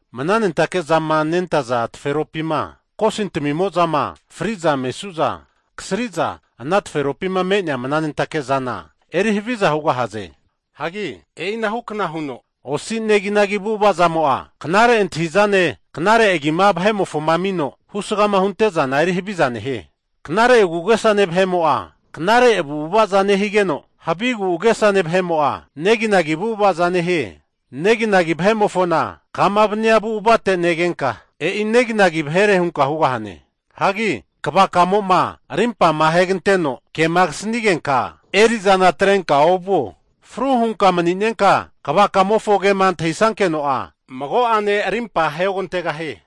Mnanentake zama nentaza taferopima kosintamimo'zama fri'za mesu'za, kasri'za ana taferopima me'nea mnanentake'zana eri haviza hugahaze. Hagi e'ina hukna huno osi neginagi avu'ava zamo'a, knare antahi'zane knare agima vahe'mofoma amino husgama hunte'zana eri haviza nehie. Knare agu'agesane vahe'mo'a knare avu'avaza nehigeno, havi agu'agesane vahe'mo'a, neginagi avu'avaza nehie. Neginagi vahe'mofona kama vania avu'avate negenka, e'i neginagi vahere hunka hugahane. Hagi kvakamo'ma arimpama aheganteno kema kasanigenka, eri'zana atrenka ovuo. Fru hunka mani'nenka kvakamofo kema antahisankeno'a, mago'ane arimpa aheogantegahie.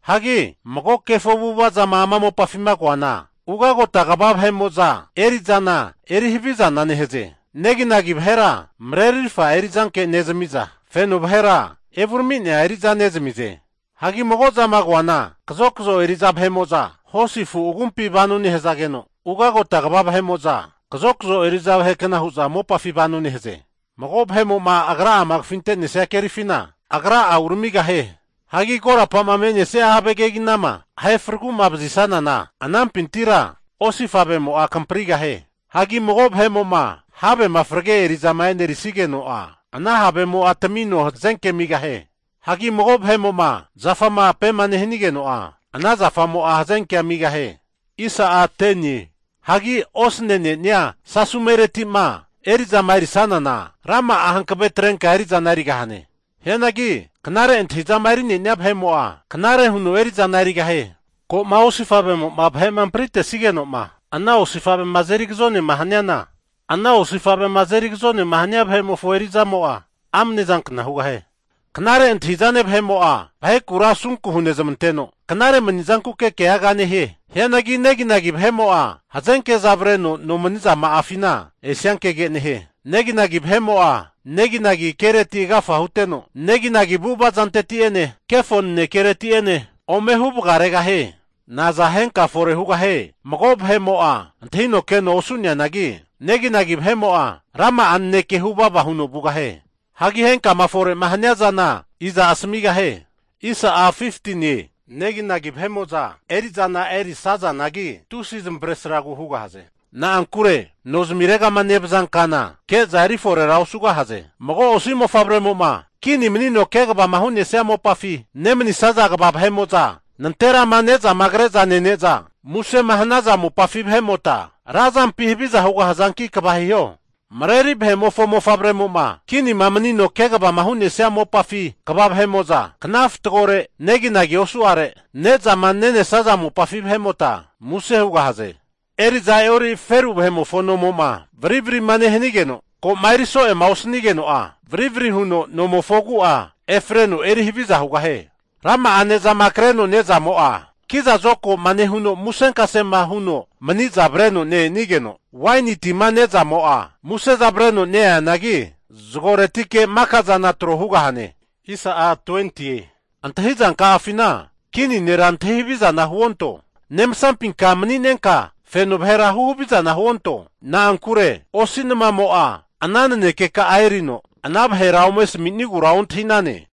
Hagi mago kefo avu'ava zama ama mopafima koana, ugagota kva vahe'mo'za eri'zana eri havizana nehaze. Neginagi vahera marerirfa eri'zanke nezami'za, feno vahera evurami'nea eri'za nezamize. Hagi mago zama koana, kazokazo eri'za vahe'mo'za hosi afu agumpi vano nehazage'za, ugagota kva vahe'mo'za kazokazo eri'za vahekna hu'za mopafi vano nehaze. Mago vahemo'ma agra'ama kafinte'nesia kerifina agra'a uramigahie. Hagi korapama me'nesia have keginama ahe fragu'ma vazisanana anampintira osifavemo'a kamprigahie. Hagi mago vahe'mo'ma havema frage eri'zama e'nerisigeno'a, ana havemo'a tamino hazenke amigahie. Hagi mago vahe'mo'ma zafama ape'ma nehanigeno'a, ana zafamo'a hazenkea amigahie. Hagi osane'nenia sasumereti'ma eri'zama erisanana rama'a hankave atrenka eri'zana erigahane. Hianagi knare antahi'zama erinenia vahe'mo'a knare huno eri'zana erigahie. Ko'ma osifavemo'ma vahe'ma ampritesigeno'ma ana osifavema azeri agazonema haniana, ana osifavema azeri agazonema hania vahe'mofo eri'zamo'a amnezankna hugahie. Knare antahi'zane vahe'mo'a vahekura asunku hunezamanteno knare mani'zankuke keaga nehie. Hianagi neginagi vahe'mo'a hazenke'za avreno nomani'zama'afima esiankege nehie. Neginagi vahe'mo'a neginagi kereti agafa huteno, neginagi avu'ava zanteti'ene kefo nanekereti'ene ome hu vagaregahie. Naza henka fore hugahie mago vahe'mo'a antahino keno osu'neanagi, neginagi vahe'mo'a rama'a naneke huvava huno vugahie. Hagi henkama fore'ma hania zana iza asamigahie? Neginagi vahe'mo'za eri'zana eri'sazanagi tusi zamavaresragu hugahaze. Na'ankure nozamiregama nevaza kana ke'za eri forera osugahaze. Mago osi mofavremo'ma kini manino kegavama hu'nesia mopafima nemanisaza kva vahe'mo'za nanterama ne'zama kre'za nene'za musema hanaza mopafi vahe'mota, razampi haviza hugahazanki kva hiho. Mareri vahe'mofo mofavremo'ma kinima manino kegavama hu'nesia mopafi kva vahe'mo'za kna fatagore neginagi osu'are nezama nenesaza mopafi vahe'mota muse hugahaze. Eri'za e'ori feru vahe'mofo nomo'ma varivarima nehanigeno ko'ma eri so'ema osanigeno'a varivari huno nomofo agu'afi efreno eri haviza hugahie. Rama'a ne'zama kreno ne'zamo'a kiza zokagoma nehuno musenkasema huno mani'za avreno ne-enigeno, waini tima nezamo'a museza avreno neanagi, zagoretike makazana tro hugahane. Antahizanka'afina kini nera antahi havizana huonto. Nemsampinka maninenka feno vahera huhavizana huonto. Na'ankure osi namamo'a ana nanekeka'a erino ana vahera ome asmi'nigura ontahi'nane.